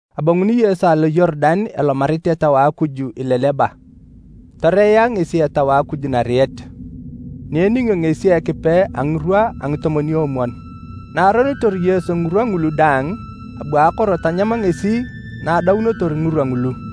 Abonguni Yesu alo Yorudan elomarit Etau a Akuj ileleba, toreea ngesi Etau a Akuj nariet, ni eningio ngesi Ekipe a ngirwa a ngitomwon-omwon. Na aronitor Yesu ngirwa ngulu daang, abu akoro tanyam ngesi na adaunotor ngirwa ngulu.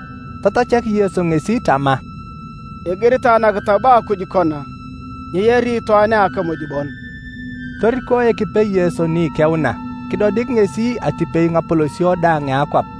Tatachak Yesu ngesi tama, “Igiritae nakitab a Akuj kona, ‘Nyeyari itwaan a akimuj bon!’” Toriko Ekipe Yesu ni ikeuna, kidodik ngesi atipei ngapolosio daang a akwap.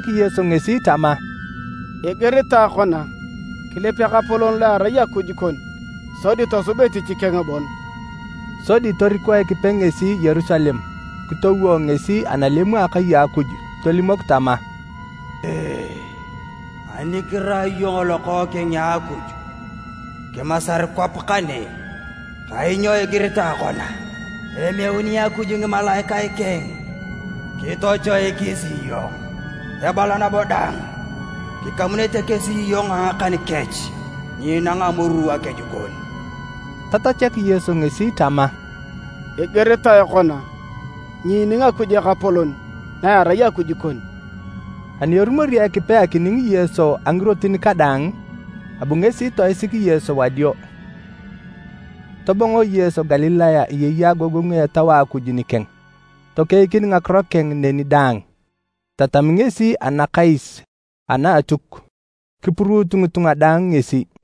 Tatachak Yesu ngesi tama, “Igiritae kona, ‘Kilip Ekapolon lo erai Akuj kon sodi tosub etich keng bon!’” Sodi toriko Ekipe ngesi Yerusalem kitowo ngesi analem a Akai a Akuj tolimok tama, “Ani kirai iyong Lokookeng a Akuj, kimasar kwap kane. Kainyo igiritae kona, ‘Emeuni Akuj ngimalaikae keng kitochoikis iyong.’ Ebala nabo dang, ‘Kikamunete kesi iyong a ngakan kech nyenang amoru akeju kon.’” Tatachak Yesu ngesi tama, “Igiritae kona, ‘Nyiining Akuj Ekapolon na erai Akuj kon.’” Ani erumori Ekipe akining Yesu a ngirotin kadaang, abu ngesi toisik Yesu wadio. Tobongo Yesu Galilaya eyei agogongu a Etau a Akuj nikeng. Tokeikin ngakiro keng neni daang. Etatami ngesi anakais ana Atuk, kipuruut ngitunga daang ngesi.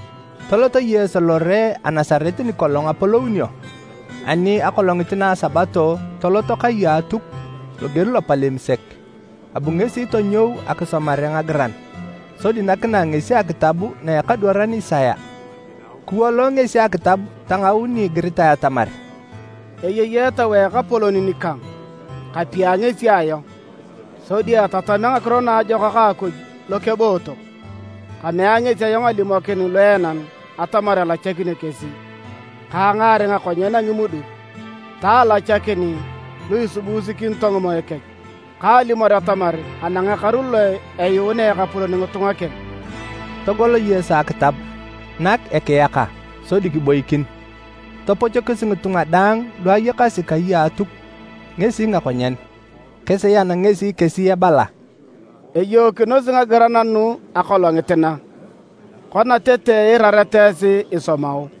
Tolot Yesu lore a Nasaret nikolong apolounio, ani akolongit na Sabato tolot kai a Atuk loger lopalem sek. Abu ngesi tonyou akisomare ngagiran sodi nakinae ngesi akitab na a ekadwaran Isaya. Kiwolo ngesi akitab tangau ni igiritae atamar, “Eyei Etau a Ekapolon nikang, kapia ngesi ayong, sodi etatamea Ngakiro Naajokak a Akuj lokebootok. Kamea ngesi ayong alimokin luenan atamar elachakinio kesi, ka angaar ngakonyen a ngimuduk, ta alachakin lu isibuusikinito ngimoe kech, ka alimor atamar anang ekaru lo eyuunea Ekapolon ngitunga keng.” Togol Yesu akitab, nak ekiyaka, sodi kiboikin. Topochokis ngitunga daang lu ayakasi kai a Atuk ngesi ngakonyen. Kisian ngesi kesi ebala, “Eyookinosi ngagiran nugu akolongit na, kona tete iirareta esi isomao.”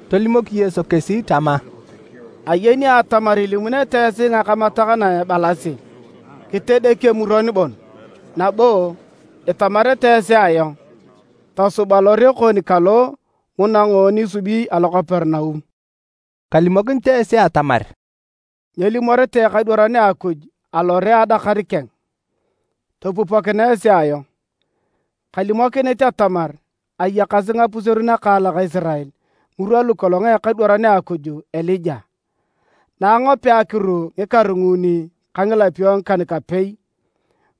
Tolimok Yesu kesi tama, “Ayeni atamar ilimunete esi ngakamatak na ebalasi, ‘Kitedek emuron bon.’ Nabo itamarete esi ayong, ‘Tosub alore kon kalo nguna ngoon isubi alo Kaperinaum.’” Kalimokinit esi atamar, “Nyelimoritae ekadwaran a Akuj alore a adakar keng. Topupokinae esi ayong: Kalimokinit atamar ayakasi ngapuseru nakaalak Isirael ngirwa lukolong a ekadwaran a Akuj Elija, na angopea akiru ngikaru nguuni ka ngilapio ngikan-kapei,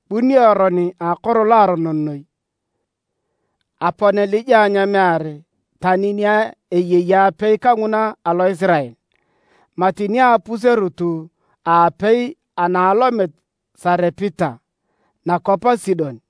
bunio eron a akoro loaronon noi. Apon Elija nyeemear tani ni eyei apei kanguna alo Isirael, mati ni a apuserut a apei ana alomit Sarepita, nakwap a Sidon.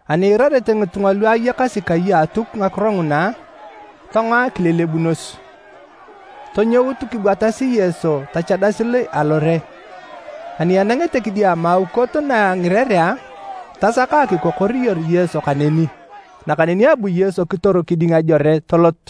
Ani iirarete ngitunga lu ayakasi kai a Atuk ngakiro nguna, tongoa kilelebunos. Tonyout kibwatasi Yesu tachadasi alore, ani enangete kidiama aukot na a ngirerea, tasaka akikokoriyor Yesu kaneni. Nakaneni abu Yesu kitor kiding ajore tolot.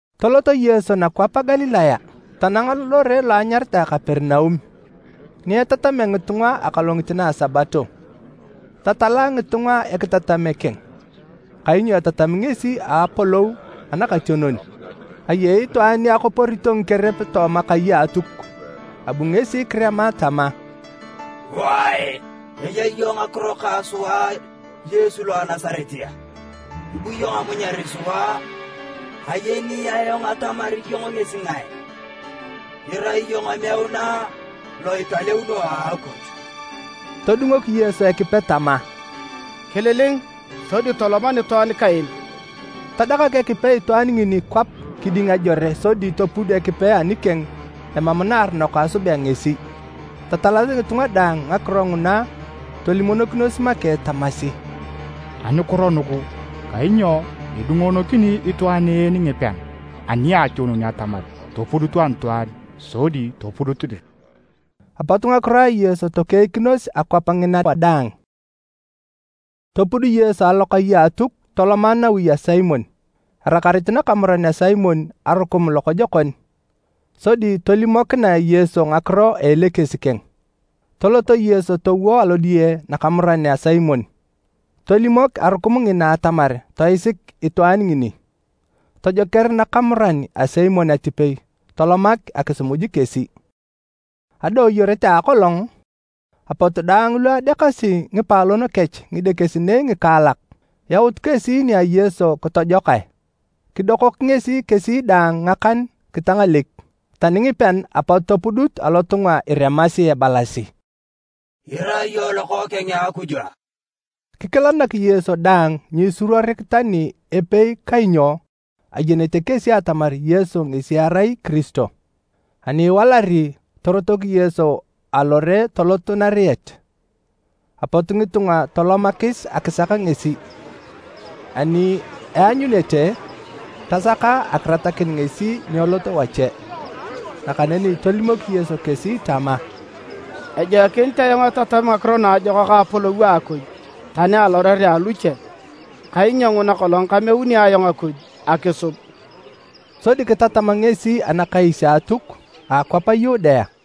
Tolot Yesu nakwap a Galilaya tanang lore lo anyaritae Kaperinaum, ni etatamea ngitunga akolongit na a Sabato. Tatala ngitunga ekitatame keng, kainyo etatami ngesi a apolou anakationon. Ayei itwaan ni akoporito ngikerep tooma kai a Atuk, abu ngesi kirema tama, “Wae! Eya iyong ngakiro ka sua Yesu lo a Nasaret a? Ibu iyong amunyar sua a? Ayeni ayong atamar iyong ngesi ngae: Irai iyong emeuna lo italeuno a Akuj!” Todungok Yesu Ekipe tama, “Kililing sodi tolom anitwaan kaen!” Tadakak Ekipe itwaan ngini kwap kiding ajore sodi topud Ekipe anikeng emam naaronok asubea ngesi. Tatalasi ngitunga daang ngakiro nguna tolimonokinos make tamasi, “Anukiro nugu? Kainyo edungonokini itwaan en ngipean aniationon atamar topudutu anitwaan sodi topudut dir!” Apot ngakiro a Yesu tokeikinos akwap ngina wadaang. Topud Yesu alokai a Atuk toloma nawi a Simon. Erakarit nakamuran a Simon arukum lokojokon, sodi tolimokinae Yesu ngakiro a elekes keng. Tolot Yesu towo alodiye nakamuran a Simon. Tolimok arukum ngina atamar toisik itwaan ngini, tojoker nakamuran a Simon atipei tolomak akisimuj kesi. Adooyoret a akolong, apot daang lu adeakasi ngipaalon kech ngidekesinei ngikaalak, yaut kesi nia Yesu kitojokae. Kidokok ngesi kesi daang ngakan kitangalek. Tani ngipean apot topudut alotunga iremasi, ebalasi, “Irai iyong Lokookeng a Akuj!” Kikilanak Yesu daang nyiisuruorik tani epei kainyo ayenete kesi atamar Yesu ngesi erai Kiristo. Ani iwalari, torotok Yesu alore tolot nariet. Apot ngitunga tolomakis akisak ngesi, ani eanyunete, tasaka akiratakin ngesi nyeelot wache. Nakaneni tolimok Yesu kesi tama, “Ejoikinit ayong etatami Ngakiro Naajokak a Apolou a Akuj tani alorerea aluche, kainyo nguna kolong kameuni ayong Akuj akisub.” Sodi kitatam ngesi Anakais a Atuk a akwap a Yudea.